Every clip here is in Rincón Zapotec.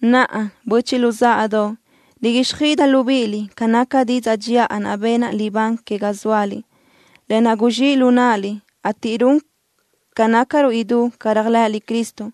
Naʼa, böchiʼ luzáʼadoʼ, riguíxjöiʼidaʼ libíʼiliʼ ca naca didzaʼ dxiʼa naʼ benaʼ libán que ga zóaliʼ, lë naʼ guzxíʼ lu náʼaliʼ, ateʼ run ga nácarö idú ca réajlëʼëliʼ Cristo.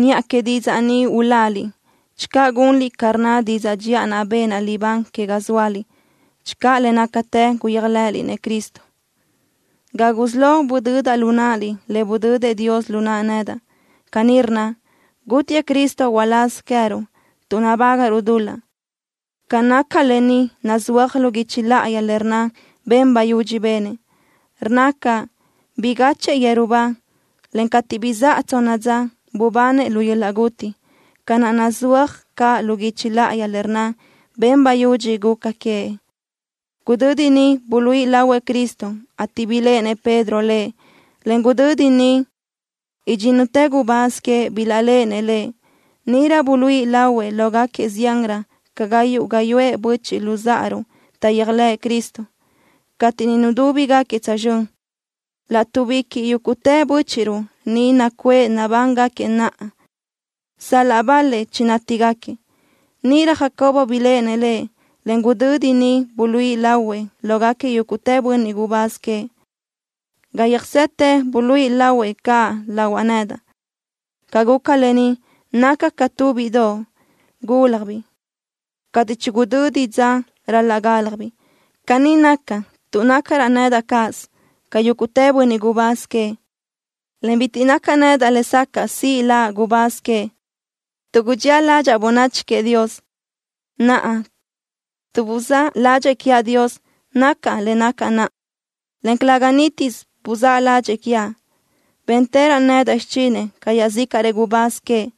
Niʼa que didzaʼ ni uláliʼ, channö gunliʼ ca rnna didzaʼ dxiʼa naʼ benaʼ libán que ga zóaliʼ, channö le nácatë guyéajlëʼëliʼ-nëʼ Cristo. Ga gusí lo budödaʼ lu náʼaliʼ le budödëʼ Dios lu naʼa nedaʼ. Caní rnna: “Gútiëʼ Cristo uláz queë́ruʼ tuʼ nabágaʼruʼ dul-laʼ.” Ca naca lë ni nazúaj lu guichi láʼayi le rnna ben bayudxi benëʼ. Rnna caʼ: “Bigachëʼë yeru ba, en cateʼ bizáʼa tsonna dza, bubanëʼ lu yöl-laʼ guti”, ca naʼ nazúaj caʼ lu guichi láʼayi le rnna ben bayudxi guca queëʼ. Gudödi niʼ buluíʼi lahuëʼ Cristo, ateʼ biléʼenëʼ Pedro Lëʼ, en gudödi niʼ idxínnutëʼ gubáz queëʼ bilaʼléʼenëʼ Lëʼ. Níʼirö buluíʼi lahuëʼ lógaquiëʼ ziánrö ca gayuʼ gáyuʼë böchiʼ luzáʼaruʼ taʼyéajlëʼë Cristo, cateʼ niʼ nudúbigaquiëʼ tsözxö́n. Laʼtuʼbiquiʼ yúguʼtëʼ bö́chiʼruʼ ni nacuʼë nabángaquiëʼ naʼa, sal-laʼ bal-lëʼ chinátigaquiëʼ. Níʼirö Jacobo biléʼenëʼ Lëʼ, en gudödi niʼ buluíʼi lahuëʼ lógaquiëʼ yúguʼtë bönniʼ gubáz queëʼ. Ga yöjsetë buluíʼi lahuëʼ caʼ lahuaʼ nedaʼ. Ca guca lë ni, nacaʼ ca tu bíʼidoʼ gúljabiʼ cateʼ chigudödi dza ral-laʼ gáljabiʼ. Caní naca, tuʼ nácaraʼ nedaʼ cáʼasö ca yúguʼtë bönniʼ gubáz queëʼ, en bitiʼ nacaʼ nedaʼ lesacaʼ siʼ laʼ gubáz queëʼ, tuʼ gudxía ládxaʼa bönachi queëʼ Dios. Naʼa, tuʼ buzáʼ ládxëʼë quiaʼ Dios nacaʼ le nacaʼ naʼa, en calëga nítisö buzáʼ ládxëʼë quiaʼ. Béntëraʼ nedaʼ xichinëʼ ca iaʼzícaʼrëʼ gubáz queëʼ,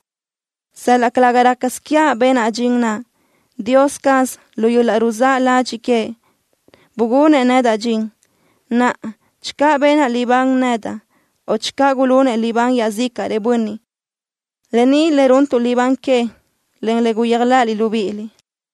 sal-laʼ calëga rácasö quiaʼ benaʼ dxin naʼ. Dios caz, lu yöl-laʼ ruzáʼ ladxiʼ queëʼ, bugunëʼ nedaʼ dxin. Naʼa, channö benaʼ libán nedaʼ o channö gulunëʼ libán iaʼzícaʼrëʼ bönniʼ, lë ni le runtuʼ libán que, en le guyéajlëʼëliʼ libíʼiliʼ.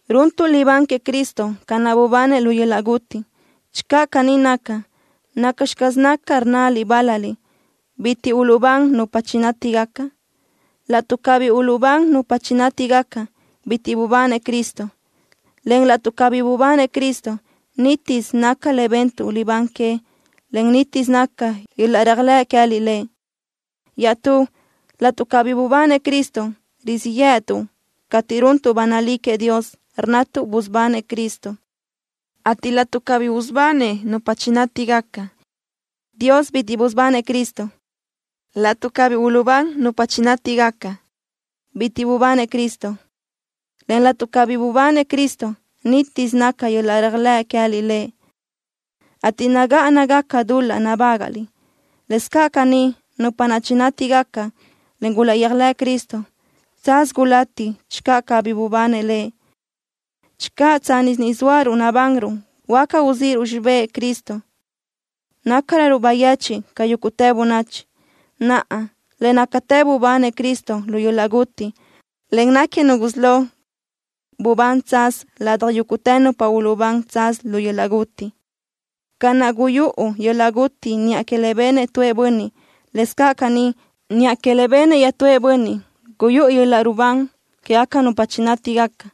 Runtuʼ libán queëʼ Cristo ca naʼ bubanëʼ lu yöl-laʼ guti. Channö caní naca, ¿nacxi caz naca, rnnaliʼ bál-laliʼ: “Bitiʼ uluʼbán nupa chinátigaca”? Laʼtuʼ cabí uluʼbán nupa chinátigaca, bitiʼ bubanëʼ Cristo, en laʼtuʼ cabí bubanëʼ Cristo, nítisö naca le bentuʼ libán que, en nítisö naca yöl-laʼ réajlëʼ queë́liʼ Lëʼ. Iaʼstú, laʼtuʼ cabí bubanëʼ Cristo, rizíʼ yë́ʼëtuʼ cateʼ runtuʼ ba nalí queëʼ Dios, rnnatuʼ busubanëʼ Cristo, ateʼ laʼtuʼ cabí usubanëʼ nupa chinátigaca, Dios bitiʼ busubanëʼ Cristo. Laʼtuʼ cabí uluʼbán nupa chinátigaca, bitiʼ bubanëʼ Cristo, en laʼtuʼ cabí bubanëʼ Cristo, nítisö naca yöl-laʼ réajlëʼ queë́liʼ Lëʼ, ateʼ nagáʼanagaca dul-laʼ nabágaʼliʼ. Lëscaʼ caní, nupa naʼ chinátigaca, en gulaʼyéajlëʼ Cristo, tsaz gulati channö cabí bubanëʼ Lëʼ. Channö tsánnisö ni zóaruʼ nabanruʼ huáca uzíʼiruʼ xibë́ʼ Cristo, nácaröruʼ bayechiʼ ca yúguʼtë bönachi. Naʼa, le nácatë bubanëʼ Cristo lu yöl-laʼ guti, en náquiëʼ nu gusí lo bubán tsaz ladaj yúguʼtë nupa uluʼbán tsaz lu yöl-laʼ guti. Ca naʼ guyúʼu yöl-laʼ guti niʼa que le benëʼ tuëʼ bönniʼ, lëscaʼ caní, niʼa que le benëʼ iaʼtúëʼ bönniʼ guyúʼu yöl-laʼ rubán quégaca nupa chinátigaca.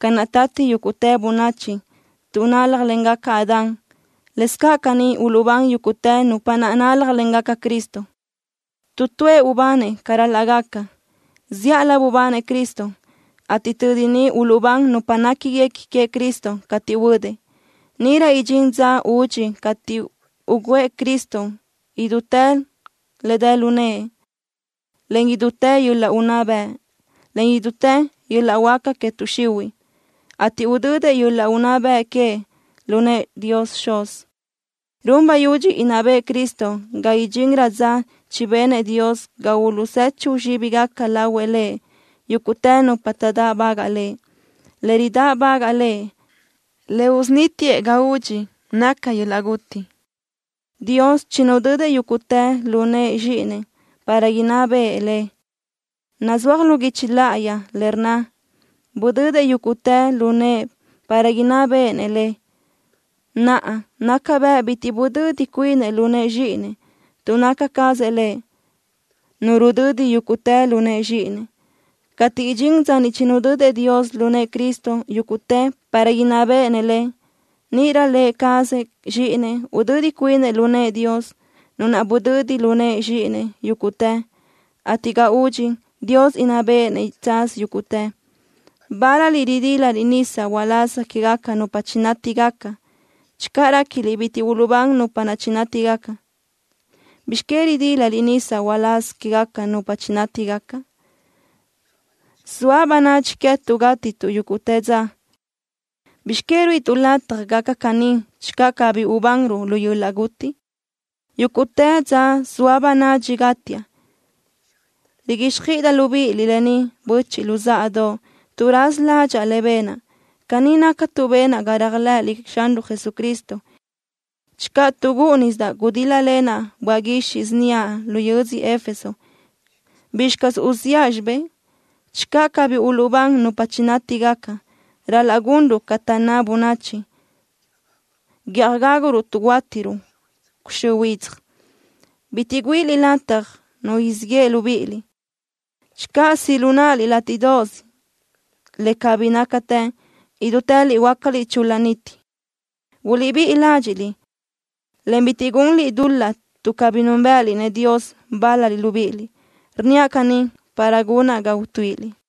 Ca naʼ tati yúguʼtë bönachi tuʼ náljlengaca Adán, lëscaʼ caní uluʼbán yúguʼtë nupa naʼ náljlengaca Cristo. Tu tuëʼ ubanëʼ ca ral-laʼ gaca. Zíʼalö bubanëʼ Cristo, ateʼ tödi ni uluʼbán nupa néquiguequi queëʼ Cristo cateʼ huödëʼ. Níʼirö idxín dza údxi cateʼ ugǘëʼ Cristo idútë le dë lu nëʼe, en idútë yöl-laʼ unná bëʼ, en idútë yöl-laʼ huáca que tuʼ xihuiʼ, ateʼ udödëʼ yöl-laʼ unná bëʼ queëʼ lu nëʼë Dios Xuz. Run bayudxi inná bëʼë Cristo ga idxinrö dza chibenëʼ Dios ga uluʼzechu zxíbigaca lahuëʼ Lëʼ yúguʼtë nupa taʼdáʼbagaʼ Lëʼ. Le ridáʼbagaʼ Lëʼ le usunítiëʼ ga údxi naca yöl-laʼ guti. Dios chinudödëʼ yúguʼtë lu nëʼë Zxíʼinëʼ para inná béʼenëʼ le. Nazúaj lu guichi láʼayi, rnna: “Budödëʼ yúguʼtë lu nëʼë para inná béʼenëʼ le.” Naʼa, naca bëʼ bitiʼ budödi cuinëʼ lu nëʼë Zxíʼinëʼ, tuʼ naca cazëʼ Lëʼ Nu rudödi yúguʼtë lu nëʼë Zxíʼinëʼ. Cateʼ idxín dza niʼ chinudödëʼ Dios lu nëʼë Cristo yúguʼtë para inná béʼenëʼ le, níʼirö Lë cazëʼ Zxíʼinëʼ udödi cuinëʼ lu nëʼë Dios, Nu naʼ budödi lu nëʼë Zxíʼinëʼ yúguʼtë, ateʼ ga údxi, Dios inná béʼenëʼ tsaz yúguʼtë. Bál-laliʼ ridílaliʼ nisa uláz quégaca nupa chinátigaca. Channö réquiliʼ bitiʼ uluʼbán nupa naʼ chinátigaca, ¿bizx que ridílaliʼ nisa uláz quégaca nupa chinátigaca? Zoa bönadxi queë́tuʼ gátituʼ yúguʼtë dza. ¿Bizx que ruíʼituʼ lataj gaca caní channö cabí ubanruʼ lu yöl-laʼ guti? Yúguʼtë dza zoa bönadxi gátiaʼ. Riguíxjöiʼidaʼ libíʼiliʼ lë ni, böchiʼ luzáʼadoʼ, tuʼ raza ládxaʼa le benaʼ. Caní naca tuʼ benaʼ ga réajlëʼëliʼ Xanruʼ Jesucristo. Channö tuʼ gúʼunisidaʼ gudíl-lalenaʼ böaʼ guixiʼ síniaʼ lu yödzö Éfeso, ¿bizxi caz uziʼa xibé? Channö cabí uluʼbán nupa chinátigaca, ral-laʼ gunruʼ ca taʼnná bönachi: “Guiʼaj gáguruʼ tuʼ huátiruʼ cuxö́ huidzaj.” Bitiʼ güíʼiliʼ lataj nu siʼ yeʼe libíʼiliʼ. Channö siʼ lu náʼaliʼ látiʼdoʼos le cabí nácatë, idútëliʼ huöácaliʼ chul-la niti. Buliʼbíʼi ládxiʼliʼ, en bitiʼ gunliʼ dul-laʼ tuʼ cabí núnbëʼëliʼ-nëʼ Dios bál-laliʼ libíʼiliʼ. Rnníaʼ caní para gunaʼ ga utuíʼiliʼ.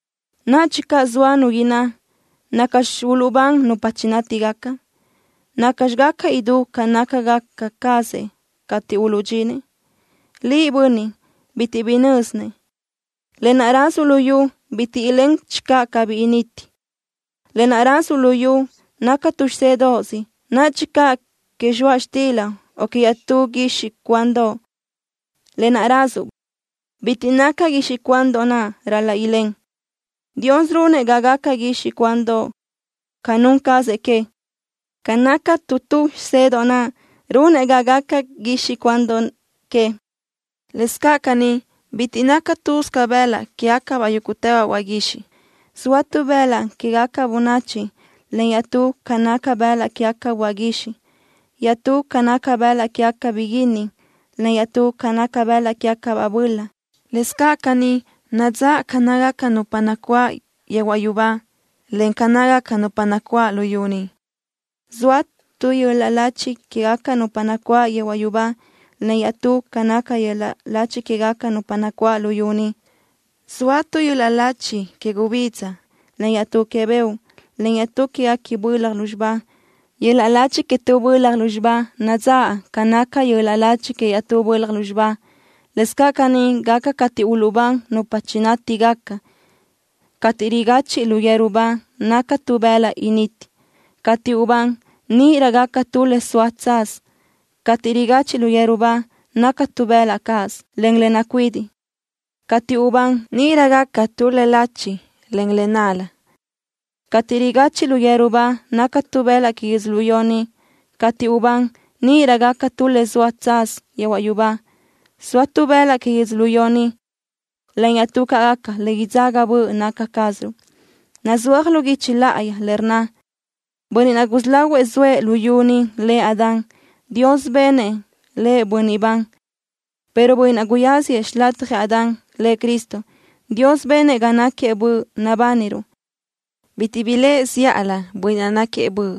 Nadxi caʼ zoa nu inná: “¿Nacxi uluʼbán nupa chinátigaca? ¿Nacxi gaca idú ca nácagaca cazëʼ cateʼ uluʼdxinëʼ?” Liʼ, bönniʼ bitiʼ bi nö́zinëʼ. Lë naʼ rázuʼ luyú bitiʼ ilén channö cabí initi. Lë naʼ rázuʼ luyú naca tu xisédoʼos, nadxi caʼ que zxoaʼ xtila o que iaʼtú guixiʼ cuandoʼ. Lë naʼ rázuʼ bitiʼ naca guixiʼ cuandoʼ naʼ ral-laʼ ilén. Dios runëʼ ga gaca guixiʼ cuandoʼ ca nun cazëʼ que. Ca naca tu tu xisedoʼ naʼ runëʼ ga gaca guixiʼ cuandoʼ que. Lëscaʼ caní, bitiʼ naca lë́bisö bëlaʼ que queë́gacabaʼ yúguʼtëbaʼ böaʼ guixiʼ. Zoa tu bëlaʼ quégaca bönachi, en iaʼtú ca naca bëlaʼ quégacabaʼ böaʼ guixiʼ. Iaʼtú ca naca bëlaʼ quégacabaʼ biguínni, en iaʼtú ca naca bëlaʼ quégacabaʼ böla. Lëscaʼ caní nadzáʼ idú ca nácagaca caz nupa nacuáʼ yehuaʼ yubá ca naca idú ca nácagaca caz nupa nacuáʼ luyú ni. Zoa tu yöl-laʼ lachi quégaca nupa nacuáʼ yehuaʼ yubá, en iaʼtú ca naca yöl-laʼ lachi quégaca nupa nacuáʼ luyú ni. Zoa tu yöl-laʼ lachi que gubidza, en iaʼtú que beoʼ, en iaʼtú quéguequi bölaj lúzxiba. Yöl-laʼ lachi que tu bölaj lúzxiba nadzáʼ ca naca yöl-laʼ lachi que iaʼtú bölaj lúzxiba. Lëscaʼ caní gaca cateʼ uluʼbán nupa chinátigaca. Cateʼ rigachiʼ lu yeru ba naca tu bëlaʼ initi. Cateʼ ubán, níʼirö gaca tu le soa tsaz. Cateʼ rigachiʼ lu yeru ba naca tu bëlaʼ cáʼasö, en le nacuidiʼ. Cateʼ ubán, níʼirö gaca tu le lachi, en le nál-la. Cateʼ rigachiʼ lu yeru ba naca tu bëlaʼ que yödzölió ni. Cateʼ ubán, níʼirö gaca tu le soa tsaz yehuaʼ yubá. Zoa tu bëlaʼ que yödzölió ni, en iaʼtú ca gaca le idzaga böʼ naca cázaruʼ. Nazúaj lu guichi láʼayi le rnna: “Bönniʼ naʼ gusí lahuëʼ zoëʼ luyú ni, lëʼ Adán, Dios benëʼ lëʼ bönniʼ ban”, pero Bönniʼ naʼ guyáziëʼ xilatjëʼ Adán, Lëʼ Cristo, Dios benëʼ ga náquiëʼ Böʼ nabániruʼ. Bitiʼ blëʼë zíʼalö Bönniʼ naʼ náquiëʼ Böʼ.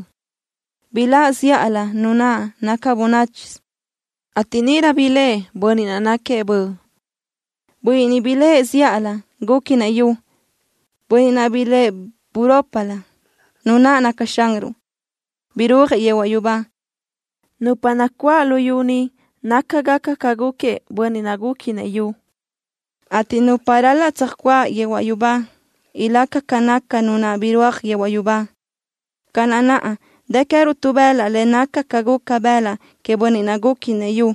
Blaʼ zíʼalö nu naʼ naca bönáchisö, ateʼ níʼirö blëʼë Bönniʼ naʼ náquiëʼ Böʼ. Bönniʼ niʼ blëʼë zíʼalö, gúquinëʼ yu. Bönniʼ naʼ blëʼë burópilö, Nu naʼ naca Xanruʼ, birúajëʼ yehuaʼ yubá. Nupa nacuáʼ luyú ni nácagaca ca gúquiëʼ bönniʼ naʼ gúquinëʼ yu, ateʼ nupa ral-laʼ tsöjcuáʼ yehuaʼ yubá ilaca ca naca Nu naʼ birúaj yehuaʼ yubá. Ca naʼ naʼa dë queë́ruʼ tu bëlaʼ le naca ca guca bëlaʼ queëʼ bönniʼ naʼ gúquinëʼ yu,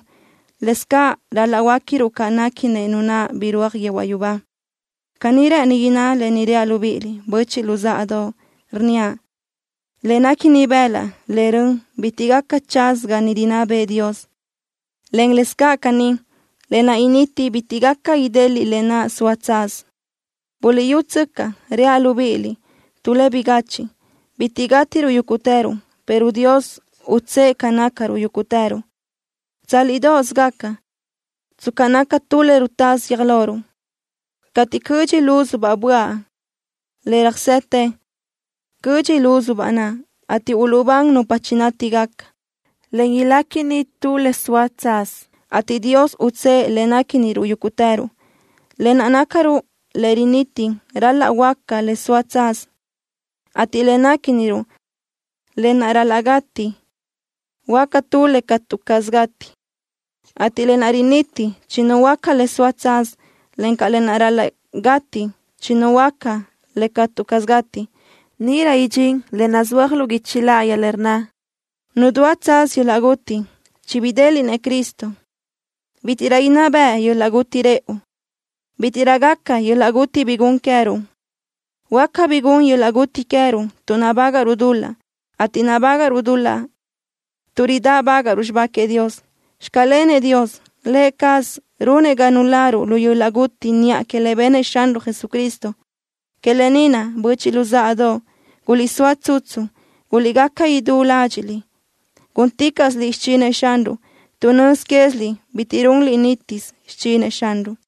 lëscaʼ ral-laʼ huöéquiruʼ ca néquinëʼ Nu naʼ birúaj yehuaʼ yubá. Caní rë́ʼëni inná lë ni reaʼ libíʼiliʼ, böchiʼ luzáʼadoʼ, rnníaʼ: Le néquini bëlaʼ, en rön bitiʼ gaca tsaz ga niʼ rinná bëʼë Dios, en lëscaʼ caní, lë naʼ initi bitiʼ gaca ideliʼ lë naʼ soa tsaz. Buliʼyútsöcaʼ, reaʼ libíʼiliʼ tu le bigachiʼ: Bitiʼ gátiruʼ yúguʼtëruʼ, pero Dios utsë́ʼë ca nácaruʼ yúguʼtëruʼ. Tsálidoʼos gaca, tsca naca tu le rutásö guiö́j loruʼ, cateʼ cödxi lúzubaʼ böaʼ le röjsetë. Cödxi lúzubaʼ naʼ, ateʼ uluʼbán nupa chinátigaca, en iléquini tu le soa tsaz, ateʼ Dios utsë́ʼë le néquiniruʼ yúguʼtëruʼ. Lë naʼ nácaruʼ le riniti ral-laʼ huöáca le soa tsaz, ateʼ le néquiniruʼ, lë naʼ ral-laʼ gati, huöáca tu le catu caz gati. Cateʼ lë naʼ riniti chinuhuöáca le soa tsaz, encaʼ lë naʼ ral-laʼ gati chinuhuöáca le catu caz gati, níʼirö idxín lë naʼ nazúaj lu guichi láʼayi, le rnna: Nadúa tsaz yöl-laʼ guti. Chibidéliʼnëʼ Cristo. Bítiʼrö inná beʼe yöl-laʼ guti rëʼu. Bítiʼrö gaca yöl-laʼ guti bi gun queë́ruʼ. Huáca bi gun yöl-laʼ guti queë́ruʼ tuʼ nabágaʼruʼ dul-laʼ, ateʼ nabágaʼruʼ dul-laʼ tuʼ ridáʼbagaʼruʼ xibá queëʼ Dios. ¡Xclenëʼ Dios! ¡Lë cazëʼ runëʼ ga nuláruʼ lu yöl-laʼ guti niʼa que le benëʼ Xanruʼ Jesucristo! Que lë ni naʼ, böchiʼ luzáʼadoʼ, guliʼsóa tsutsu. Guliʼgaca idú ládxiʼliʼ, gúnticaʼsiliʼ xichinëʼ Xanruʼ tuʼ nöz quéziliʼ bitiʼ runliʼ nítisö xichinëʼ Xanruʼ.